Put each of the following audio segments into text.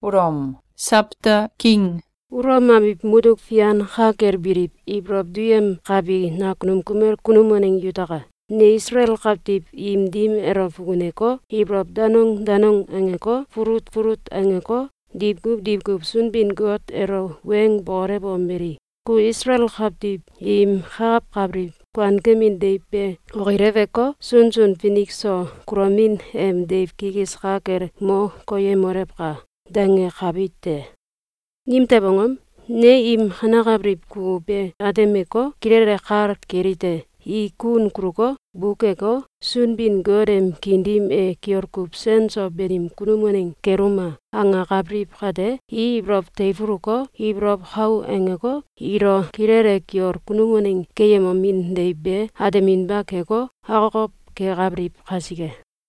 Ulom abiw mutuk fian ka kel biliw ibolow duyemkabi nakunum kumel kunum waneng yutaka! Ne Isalael kawtiw im dim elo fukuneko, ibolow danong danong angeko, fulut fulut angeko, diwkuw diwkuw Sunbin-Got elo weng bokolewomeli: “Ku Isalael kawtiw im kakawkabiliw kuankemin deiw be okileweko, sunsun finik so kulomin em deiw kikis ka kel mo koyemolewka!”, dangekabi te. Nimtew angom? Ne im kanekabiliw kukuw be atemeko, kilele kal kelite: I kun kuluko, bukeko, “Sunbin-Got em kiin dim e kiol kuw sen so banim kunum waneng keluma!”, angakabiliw kate, i ibolow teifuluko, ibolow kau angeko, ilo kilele kiol kunum waneng keyemomin deiw be ateminba keko, akokow kekabiliw kasike.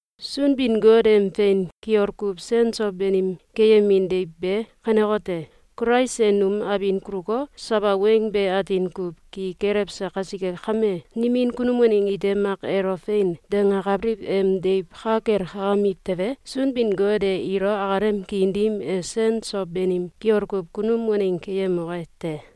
Sunbin-Got em fein kiol kuw sen so banim keyemin deiw be kanekote: Kulais e num abin kuluko, sawa weng be atin kuw ki kelewse kasike kame, nimin kunum waneng ite mak elo “Fein!”, dangakabiliw em deiw ka kel kakamiw tewe, Sunbin-Got e ilo akalem kiin dim e sen so banim kiol kuw kunum waneng keyemoke te.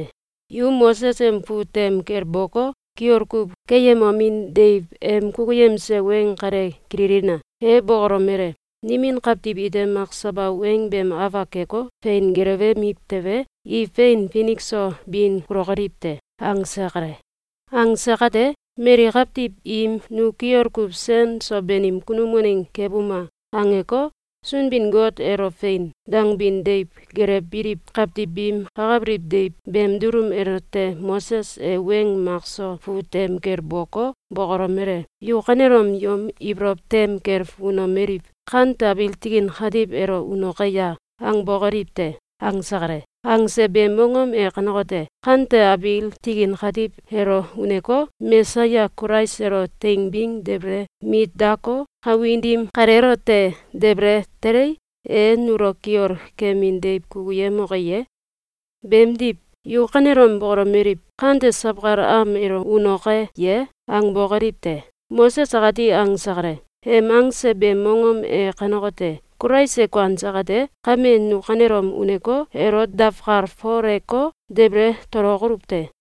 Yu Moses em fut tem kel boko, kiol kuw keyemomin deiw em kukuyemse weng kale kililina! E bokolomele: “Nimin kawtiw ite mak sawa weng beem afak keko, fein gelewemiw tewe, i fein finik so bin kulokoliw te.”, angse kale. Angse kate, mali kawtiw im “Nu kiol kuw sen so banim kunum waneng kebuma!”, angeko, Sunbin-Got elo “Fein!”, dangbin deiw gelewbiliw kawtiw biim kakabiliw deiw beem dulum elote Moses e weng mak so fut tem kel boko, bokolomele: “Yu kanelom yom ibolow tem kel fukunemomeliw: ‘Kante abiil tikin katiw elo unoke ya?’, angbokoliw te!”, angse kale. Angse beem mongom e kanekote: Kante abiil tikin katiw elo uneko, Mesaya Kulais elo teingbing debele mit dako, kawin dim kaleelote debele telei, e nulo kiol kemin deiw kukuyemoke ye? Beemdiw, “yu kanelom bokolomeliw: ‘Kante sawkal am elo unoke ye?’, angbokoliw te!”, Moses akati angse kale. Em angse beem mongom e kanekote: Kulais e kuanse kate, kame nu kanelom uneko, elo dawkalfoleko, debele tolokoluw te!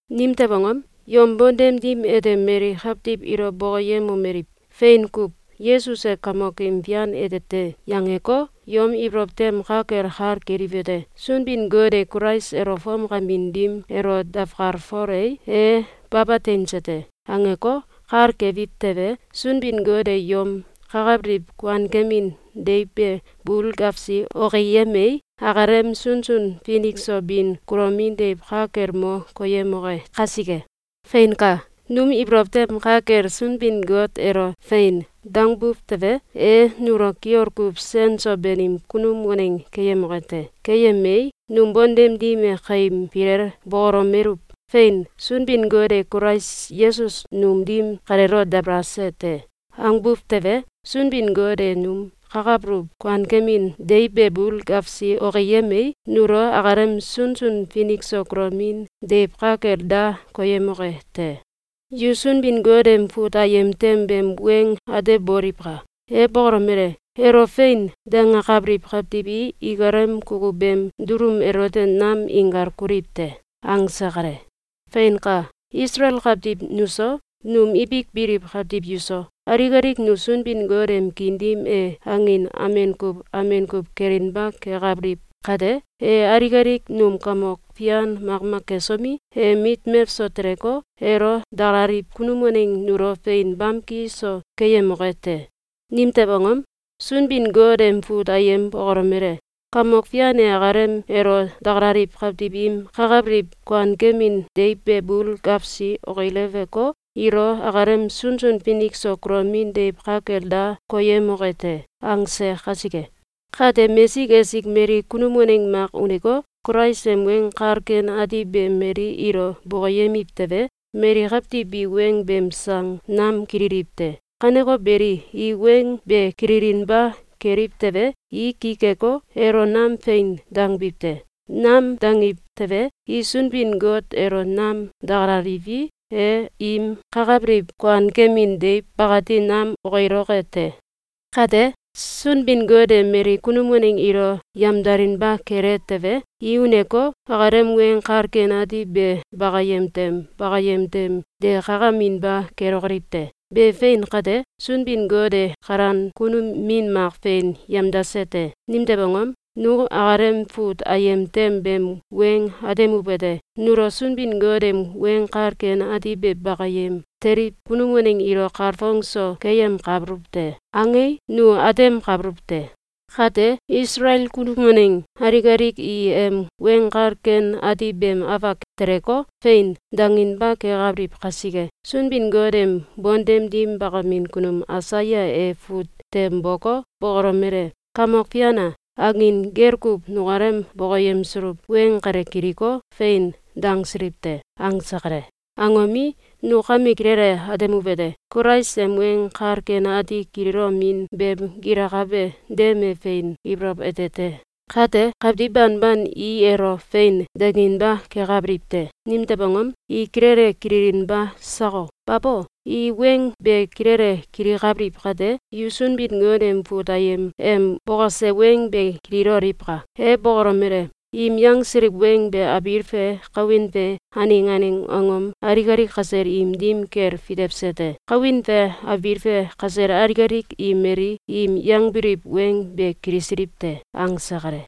Nimtew angom? Yom bontem dim ete mali kawtiw ilo bokoyemomeliw: “Fein kuw! Yesus e Kamokim Fian ete te!”, yangeko, yom ibolow tem ka kel kal keliwete: “Sunbin-Got e Kulais elo fomkamin dim elo dawkalfolei, e baba teinse te!”, angeko, kal kebiw tewe, Sunbin-Got e yom kakabiliw kuankemin deiw be bul gewsi okiyemei, akalem sunsun finik so bin kulomin deiw ka kel mo koyemoke kasike. Feinka! Num ibolow tem ka kel Sunbin-Got elo “Fein!”, dangbu tewe, e nulo kiol kuw sen so banim kunum waneng keyemoke te. Keyemei, num bontem dim e kaim filel bokolomeluw: “Fein! Sunbin-Got e Kulais Yesus num dim kaleelo dabalase te!”, angbuw tewe, Sunbin-Got e num kakabuluw kuankemin deiw be bul gewsi okiyemei, nulo akalem sunsun finik so kulomin deiw ka kel da koyemoke te. Yu Sunbin-Got em fut ayem tem beem weng ateboliwka! E bokolomele: “Elo “Fein!”, dangakabiliw kawtiw i ikalem kukuw beem dulum elote nam inkal kuliw te.”, angse kale. Feinka! Isalael kawtiw nuso, num ibik biliw kawtiw yuso, alik alik nu Sunbin-Got em kiin dim e angin amen kuw amen kuw kelinba kekabiliw kate, e alik alik num kamok fian makmak kesomi, em mit mewso teleko, elo dakalaliw kunum waneng nulo fein bamki so keyemoke te. Nimtew angom? Sunbin-Got em fut ayem bokolomele: “Kamok Fian e akalem elo dakalaliw kawtiw im kakabiliw kuankemin deiw be bul gewsi okileweko, ilo akalem sunsun finik so kulomin deiw ka kel da koyemoke te.”, angse kasike. Kate, mesik esik mali kunum waneng mak uneko, Kulais em Weng Kal Ken Ati be mali ilo bokoyemiw tewe, mali kawtiw bi weng beem sang nam kililiw te. Kaneko beli, i weng be kililinba keliw tewe, i ki keko, elo nam “Fein!” dangbiw te. Nam dangiw tewe, i Sunbin-Got elo nam dakalaliwi, e im kakabiliw kuankemin deiw bakati nam okiloke te. Kate, Sunbin-Got e mali kunum waneng ilo yamdalinba kele tewe, i uneko, akalem Weng Kal Ken Ati be bakayem tem bakayem tem de kakaminba kelokoliw te. Be fein kate, Sunbin-Got e kalan kunum min mak fein yamdase te. Nimtew angom? Nu akalem fut ayem tem beem weng atemuwete: “Nulo Sunbin-Got em Weng Kal Ken Ati be bakayem teliw kunum waneng ilo kalfongso keyemkabuluw te.”, angei, nu atemkabuluw te. Kate, Isalael kunum waneng alik alik i em Weng Kal Ken Ati beem afak teleko, “Fein!”, danginba kekabiliw kasike, Sunbin-Got em bontem dim bakamin kunum Aisaya e fut tem boko, bokolomele: “Kamok Fian a! Angin gel kuw nukalem bokoyemsuluw weng kale kiliko, ‘Fein!’, dangsiliw te!”, angse kale. Angomi, nu kame kilele atemuwete: Kulais em Weng Kal Ken Ati kililomin beem gilakabe dem e fein ibolow ete te. Kate, kawtiw banban i elo “Fein!”, danginba kekabiliw te. Nimtew angom? I kilele kililinba sako? Babo! I weng be kilele kilikabiliw kate, yu Sunbin-Got em fut ayem em bokose weng be kililoliwka! E bokolomele: “Im yangsiliw weng be abiil fe kawin fe aneng aneng angom alik alik kasel im dim kel fitewse te. Kawin fe abiil fe kasel alik alik i mali im yangbiliw weng be kilisiliw te.”, angse kale.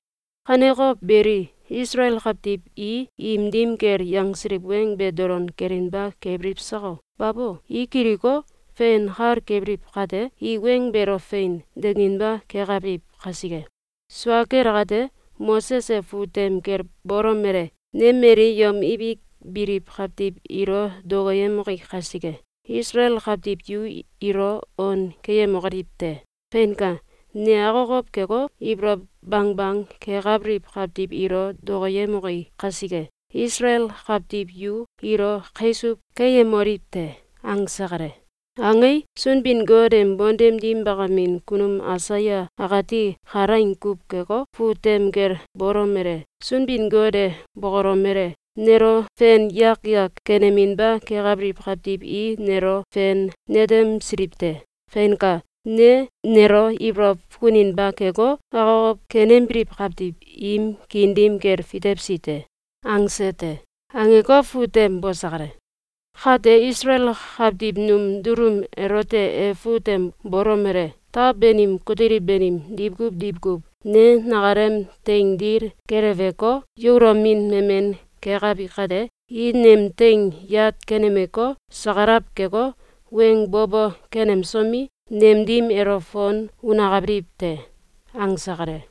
Kaneko beli, Isalael kawtiw i im dim kel yangsiliw weng be dolon kelinba kebiliw sako? Babo! I kiliko, fein kal kebiliw kate, i weng beelo “Fein!”, danginba kekabiliw kasike. Sua kel akate, Moses e fut tem kel bolomele: “Ne mali yom ibik biliw kawtiw ilo dokoyemoki kasike, Isalael kawtiw yu ilo on keyemokoliw te. Feinka! Ne akokow keko, ibolow bangbang kekabiliw kawtiw ilo dokoyemoki kasike, Isalael kawtiw yu ilo kaisuw keyemoliw te.”, angse kale. Angei, Sunbin-Got em bontem dim bakamin kunum Aisaya akati kalaing kuw keko, fut tem kel bolomele: “Sunbin-Got e bokolomele: ‘Nelo fen yak yak keneminba kekabiliw kawtiw i nelo fein netemsiliw te. Feinka! Ne nelo ibolow fukuninba keko, akokow kenembiliw kawtiw im kiin dim kel fitewsi te.’, angse te.”, angeko, fut tem bose kale. Kate Isalael kawtiw num dulum elote e fut tem bolomele: “Taw banim kutiliw banim diwkuw diwkuw ne nakalem teing dil keleweko, yaulomin memen kekabi kate, i nem teing yat kenemeko, sakalaw keko, weng bo bo kenemsomi, nem dim elo fon unakabiliw te.”, angse kale.